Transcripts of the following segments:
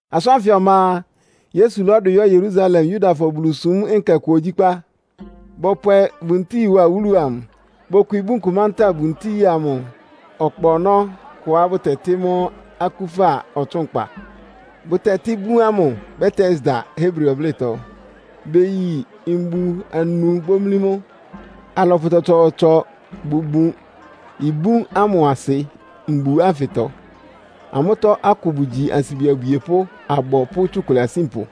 Asʋ́n ánfɩ ɔma a, Yesu lɔ́dʋ yɔ́ Yerusalem Yudafɔ Bulusúm nkɛ kʋ ogyíkpá. Bɔpwɛ buntíi wá wúlu amʋ. Bokwi ibún kʋ mantáa buntíi amʋ ɔkpa ɔnɔ́ kʋá bʋtɛtɩ́ mʋ́ Akúfa Ɔtsʋ́nkpa. Bʋtɛtɩ́ ibún ámʋ Betesda Hebri ɔblɩ́tɔ. Beyi mbu anu bómlí mʋ́. Alɔpʋ tsɔtsɔɔtsɔ bʋbun ibún ámʋ asɩ mbu ánfɩtɔ. Amʋ́tɔ́ akʋ bʋgyi ansibi abwiepʋ́, abɔ pʋ́ tsukʋlɛ asínpʋ.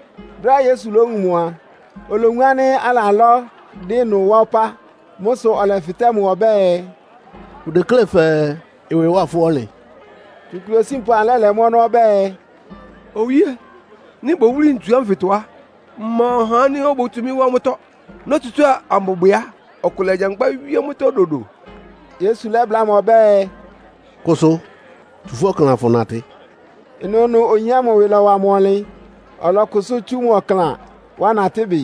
Brɛ́á Yesu lówun mʋ a, olowun ánɩ́ alalɔ́, dɩ́ ɩnʋ wá ɔpá. Mʋ́ sʋ ɔlɛfɩtɛ́ mʋ ɔbɛ́ɛ, “Fʋdeklé fɛɛ ɩwɩ ɩwá fʋ́ ɔnlɩn?” Tsukʋlɛ osínpʋ amʋ lɛ́lɛ mʋ́ ɔnɔ́ ɔbɛ́ɛ, “Owíé, nɩ́ bowúli ntsu ámʋtɔ á, mma ɔhá ánɩ́ obótsu mɩ́ wá mʋ́tɔ́. Nótsutsúa ambɔbwɛ á, ɔkʋ lagyankpá wíé mʋ́tɔ́ dodo.” Yesu lɛ́bláa mʋ ɔbɛ́ɛ, “Kʋsʋ! Tsu fʋ́ ɔklan, afʋnatɩ!” Ɩnʋnʋʋnʋ oyin ámʋ ɩwɩ lɔ́wa mʋ ɔnlɩn, ɔlɔkʋsʋ́ tsú mʋ ɔklan, wá natɩ́ bɩ.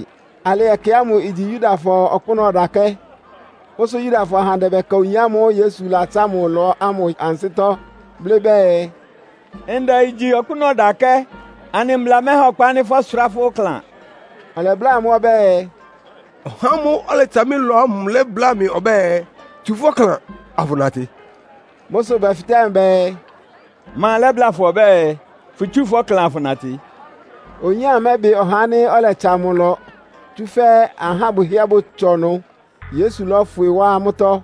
Alɩ ɛkɛ ámʋ igyi Yudafɔ Ɔkpʋ́nʋ́ Ɔdakɛ́. Mʋ́ sʋ Yudafɔ ahandɛ bɛka oyin ámʋ́ʋ́ Yesu latsá mʋ ɩlɔ ámʋ ansɩ́tɔ́, blɩ́ bɛɛ, “Ndɛ igyi Ɔkpʋ́nʋ́ Ɔdakɛ́. Anɩ mbla mɛha ɔkpa ánɩ́ fɔ́sʋrá fʋ́ ɔklan.” Ɔlɛbláa amʋ́ ɔbɛ́ɛ, “Ɔhá ámʋ́ʋ́ ɔlɛtsa mɩ́ ɩlɔ ámʋ lɛ́bláa mɩ́ ɔbɛ́ɛ, ‘Tsu fʋ́ ɔklan, afʋnatɩ.’” Mʋ́ sʋ bɛfɩtɛ́ mʋ bɛɛ, “Ma lɛ́bláa fʋ ɔbɛ́ɛ, fʋtsúu fʋ́ ɔklan afʋnatɩ?” Oyin ámʋ mɛ́bɩ ɔhá ánɩ́ ɔlɛtsa mʋ ɩlɔ, tsúfɛ́ ahá bʋhɩ́ɛ́ bʋtsɔ ɩnʋ, Yesu lɔ́fwɩ wá amʋ́tɔ́.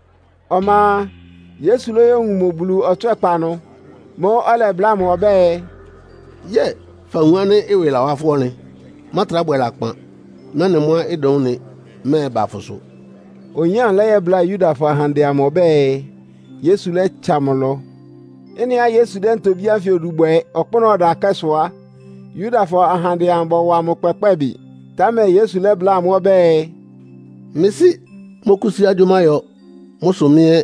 Ɔma a, Yesu lóyówun mʋ Bulu ɔtswɛ́kpa ɩnʋ. Mʋ́ʋ́ ɔlɛbláa mʋ ɔbɛ́ɛ, “Yɛ́ɛ fawun ánɩ́ ɩwɩ lawá fʋ́ ɔnlɩn. Mátrá bwɛ lakpan, mɛ́nɩ mʋ́á ɩdʋn ɩ́nɩ mɛ́ɛba fʋsʋ.” Oyin ámʋ lɛ́yɛ́bláa Yudafɔ ahandɛ amʋ ɔbɛ́ɛ, Yesu lɛ́tsa mʋ ɩlɔ. Ɩ́nɩá Yesu dɛ́ ntobí ánfɩ odu bwɛ ɔkpʋ́nʋ́ ɔdakɛ́ sʋ á, Yudafɔ ahandɛ amʋ bɔwa mʋ kpɛkpɛ́ɛ bɩ. Támɛ Yesu lɛ́bláa amʋ́ ɔbɛ́ɛ, “Mɩ́ Sɩ́ mɔ́kʋ́sí agyʋ́má yɔ. Mʋ́ sʋ mɩ́ ɛ́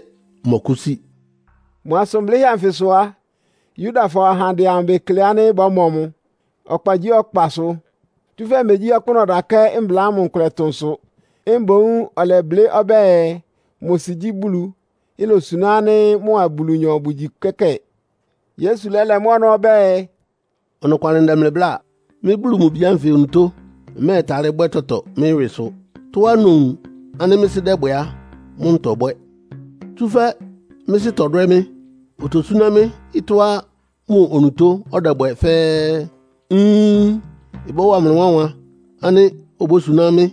mmɔkʋ́sí.” Mʋ asʋn blɩ́hɛ́ anfɩ sʋ á, Yudafɔ ahandɛ amʋ bekle ánɩ́ bɔ́mɔ mʋ ɔkpagyíɔkpasʋ. Tsúfɛ́ megyí ɔkpʋ́nʋ́ ɔdakɛ́ mbla ámʋ nkʋlɛ tʋ́ʋn sʋ, mboún ɔlɛblɩ́ ɔbɛ́ɛ, mʋ sɩ gyí Bulu, ilosuná ánɩ́ mʋa Bulunyɔ bʋgyi kɛ́kɛ́ɛ. Yesu lɛ́lɛ mʋ́ ɔnɔ́ ɔbɛ́ɛ, “Ɔnɔkwalɩ ndɛ mlɩ bláa. Mɩ́ Bulu mʋ Bi ánfɩ onutó mmɛ́ɛtalɩ́ bwɛ́ tɔtɔ mɩ́ ɩwɩsʋ. Tɔ́á nowun ánɩ́ mɩ́ Sɩ́ dɛ́bwɛ á, mʋ́ ntɔbwɛ́. Tsúfɛ́ mɩ́ Sɩ́ tɔdwɛ́ mɩ́, otosúná mɩ́ ɩtɔ́á mʋ onutó ɔdɛbwɛ fɛ́ɛ́. Inn! Ɩbɔ́wa mlɩ wánwan ánɩ́ obósuná mɩ́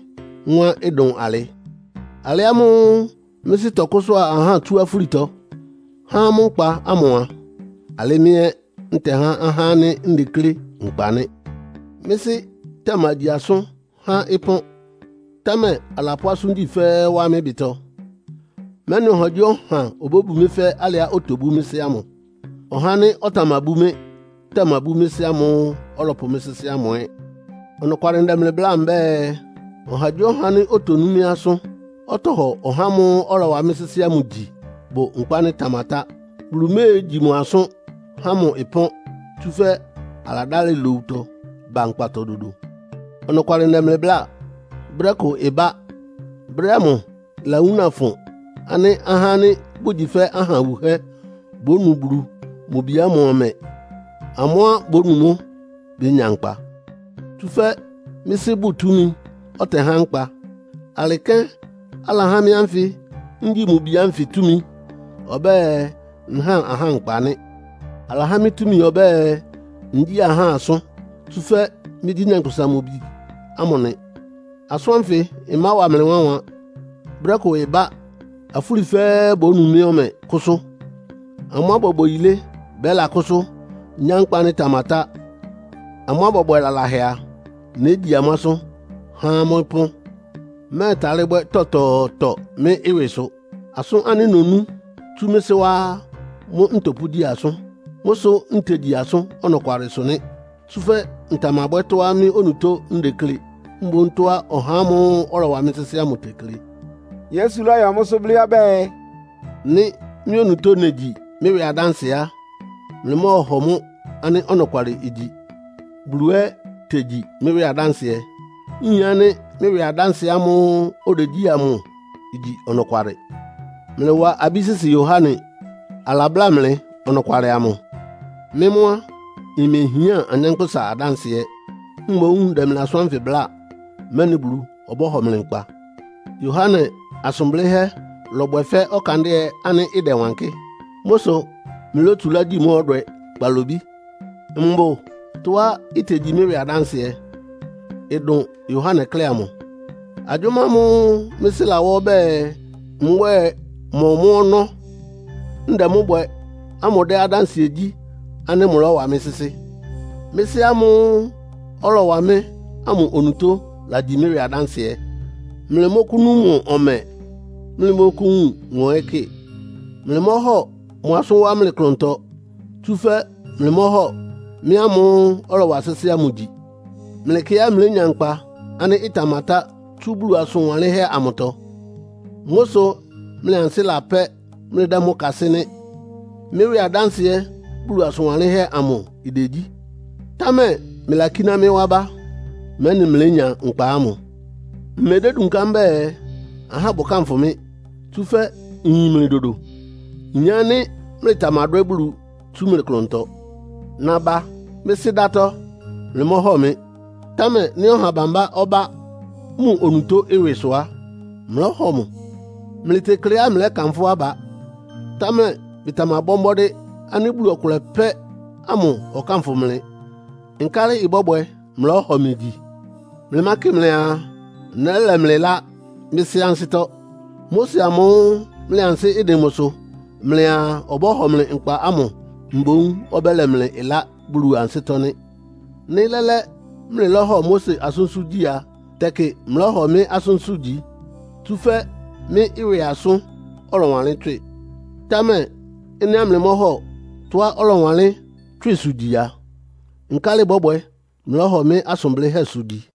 mʋ́á ɩdʋn alɩ. Alɩ ámʋ́ʋ́ mɩ́ Sɩ́ tɔkʋ́sʋá ahá tsú afúlitɔ, há amʋ́ nkpa ámʋ a, alɩ mɩ́ ɛ́ ntɛhá ahá ánɩ́ ndeklé nkpa nɩ́. Mɩ́ Sɩ́ tamagyi asʋ́n há ɩpɔ́n, támɛ alapʋ́ asʋ́ngyí fɛ́ɛ́ wá mɩ́ ɩbɩtɔ, mɛ́nɩ ɔhagyíɔha obóbu mɩ́ fɛ́ alɩá otobú mɩ́ Sɩ́ ámʋ. Ɔhá ánɩ́ ɔtamabú mɩ́ tamabú mɩ́ Sɩ́ ámʋ́ʋ́ ɔlɔpʋ mɩ́ sɩ́sɩ́ ámʋ ɛ́. “Ɔnɔkwalɩ ndɛ mlɩ bláa mbɛ́ɛ, ɔhagyíɔha ánɩ́ otonú mɩ́ asʋ́n, ɔtɔhɔ ɔhá ámʋ́ʋ́ ɔlɔwa mɩ́ sɩ́sɩ́ ámʋ gyi, bʋ nkpa ánɩ́ ɩtamatá. Bulu méegyi mʋ asʋ́n, há mʋ pɔ́n, tsúfɛ́ aladálɩ lowutɔ ba nkpatɔ dodo. Ɔnɔkwalɩ ndɛ mlɩ bláa. Brɛ́ kʋ ɩbá. Brɛ́ ámʋ ɩlawúna fʋn ánɩ́ ahá ánɩ́ bʋgyi fɛ́ aha wuhɛ́ bónu Bulu mʋ Bi ámʋ ɔmɛ. Amʋ́á bonu mʋ́ bénya nkpa. Tsúfɛ́ mɩ́ Sɩ́ bʋ́ʋ túmi, ɔtɛhá nkpa. Alɩ kɛ́n alahá mɩ́ ánfɩ ngyi mʋ Bi ánfɩ túmi, ɔbɛ́ɛ nháa ahá nkpa nɩ́. Alahá mɩ́ túmi ɔbɛ́ɛ, ngyíi ahá asʋ́n, tsúfɛ́ mɩ́gyí Nyankpʋsa-Mʋ-Bi ámʋ nɩ. Asʋ́n ánfɩ ɩmáwa mlɩ wánwan. Brɛ́ kʋ ɩbá, afúli fɛ́ɛ́ bónu mɩ́ ɔmɛ, kʋ́sʋ́. Amʋ́á bɔbwɛ yilé bɛ́lakʋ́sʋ́, nyá nkpa ánɩ́ ɩtamatá. Amʋ́á bɔbwɛ laláhɛ a, négyi amʋ́ asʋ́n, há amʋ́ ɩpɔ́n.” “Mmɛ́ɛtalɩ́ bwɛ́ tɔtɔɔtɔ mɩ́ ɩwɩsʋ. Asʋ́n ánɩ́ nonú tsú mɩ́ Sɩ́ wá á, mʋ́ ntɔpʋ́gyí asʋ́n. Mʋ́ sʋ́ ntegyi asʋ́n ɔnɔkwalɩsʋ nɩ́. Tsúfɛ́ ntamabwɛ́ tɔ́á mɩ́ onutó ndeklé, mboún tɔ́á ɔhá ámʋ́ʋ́ ɔlɔwa mɩ́ sɩ́sɩ́ ámʋ tekle.” Yesu lɔ́yɔ mʋ́sʋ́ blɩ́ ɔbɛ́ɛ, “Nɩ́ mɩ́ onutó negyi mɩ́ ɩwɩ adánsɩɛ á, mlɩmɔ́ɔhɔ mʋ́ ánɩ́ ɔnɔkwalɩ igyi. Bulu ɛ́ tegyi mɩ́ ɩwɩ adánsɩɛ. Nyin ánɩ́ mɩ́ ɩwɩ adánsɩɛ ámʋ́ʋ́ odegyí amʋ igyi ɔnɔkwalɩ. Mlɩlawá abí sɩ́sɩ́ Yohane. Alabláa mlɩ ɔnɔkwalɩ amʋ. Mɩ́ mʋ́ á, mmehián anyánkpʋ́sa adánsɩɛ. Mboún ndɛ mlɩ asʋ́n ánfɩ bláa, mɛ́nɩ Bulu ɔbɔ́hɔ mlɩ nkpa. Yohane asʋn blɩ́hɛ́ lɔbwɛ fɛ́ ɔkandɩ́ɛ ánɩ́ ɩdɛwankɩ́. Mʋ́ sʋ mlɩlótsulá gyi mʋ́ ɔdwɛ kpalobí. Mbʋ tɔ́á itegyi mɩ́ ɩwɩ adánsɩɛ, ɩdʋn Yohane klɛ́ amʋ. Agyʋ́má ámʋ́ʋ́ mɩ́ Sɩ́ lawá ɔbɛ́ɛ mbwɛ́ɛ mɔ mʋ́ ɔnɔ́, ndɛ mʋ́ bwɛ ámʋ dɛ́ adánsɩɛ gyí ánɩ́ mʋlɔ́wa mɩ́ sɩ́sɩ́. Mɩ́ Sɩ́ ámʋ́ʋ́ ɔlɔwa mɩ́ ámʋ onutó lagyi mɩ́ ɩwɩ adánsɩɛ. Mlɩmɔ́kʋ́nu mʋ ɔmɛ, mlɩmɔ́kʋ́wun mʋ ɛ́ kɩ. Mlɩmɔ́hɔ mʋ asʋ́n wá mlɩ klʋntɔ, tsúfɛ́ mlɩmɔ́hɔ mɩ́ ámʋ́ʋ́ ɔlɔwa sɩ́sɩ́ ámʋ gyi. Mlɩkɩ́á mlénya nkpa ánɩ́ ɩtamatá tsú Bulu asʋn wanlɩ́nhɛ́ amʋtɔ. Mʋ́ sʋ́ mlɩ ansɩ́ lapɛ́, mlɩdɛ́ mʋ́ kasɩ́ nɩ́. Mɩ́ ɩwɩ adánsɩɛ Bulu asʋn wanlɩ́nhɛ́ amʋ idegyí. Támɛ mlɩlakíná mɩ́ wá bá, mɛ́nɩ mlénya nkpa ámʋ. “Mmedédunká mbɛ́ɛ, ahá bʋkánfʋ mɩ́, tsúfɛ́ nyin mlɩ dodo. Nyin ánɩ́ mlɩtamadwɛ́ Bulu tsú mlɩ klʋntɔ. Naba mɩ́ Sɩ́ dátɔ́, mlɩmɔ́hɔ mɩ. Támɛ nɩ́ ɔha bambá ɔbá mʋ onutó ɩwɩsʋ á, mlɔ́hɔ mʋ. Mlɩtekleá mlɛ́kanfʋ́ aba, támɛ mlɩtamabɔ́ mbɔ́dɩ́ ánɩ́ Bulu ɔkʋlɛ pɛ́ ámʋ ɔkánfʋ mlɩ. Nkálɩ ɩbɔ́bwɛ mlɔ́hɔ mɩ gyi? Mlɩmákɩ mlɩaa, nɛ́lɛ mlɩ ɩlá mɩ́ Sɩ́ ansɩ́tɔ́. Mose amʋ́ʋ́ mlɩ ansɩ́ ɩdɩn mʋsʋ mlɩaa ɔbɔ́hɔ mlɩ nkpa ámʋ mboún ɔbɛ́lɛ mlɩ ɩlá Bulu ansɩ́tɔ́ nɩ́. Nɩ́ lɛ́lɛ́ mlɩlɔ́hɔ Mose asʋ́nsʋ́ gyi a, tɛkɩ mlɔ́hɔ mɩ́ asʋ́nsʋ́ gyi, tsúfɛ́ mɩ́ ɩwɩ asʋ́n ɔlɔwanlɩ́n tswɩ. Támɛ ɩ́nɩá mlɩmɔ́hɔ tɔ́á ɔlɔwanlɩ́n tswɩ́sʋ gyi a, nkálɩ ɩbɔ́bwɛ mlɔ́hɔ mɩ́ asʋn blɩ́hɛ́sʋ gyi?”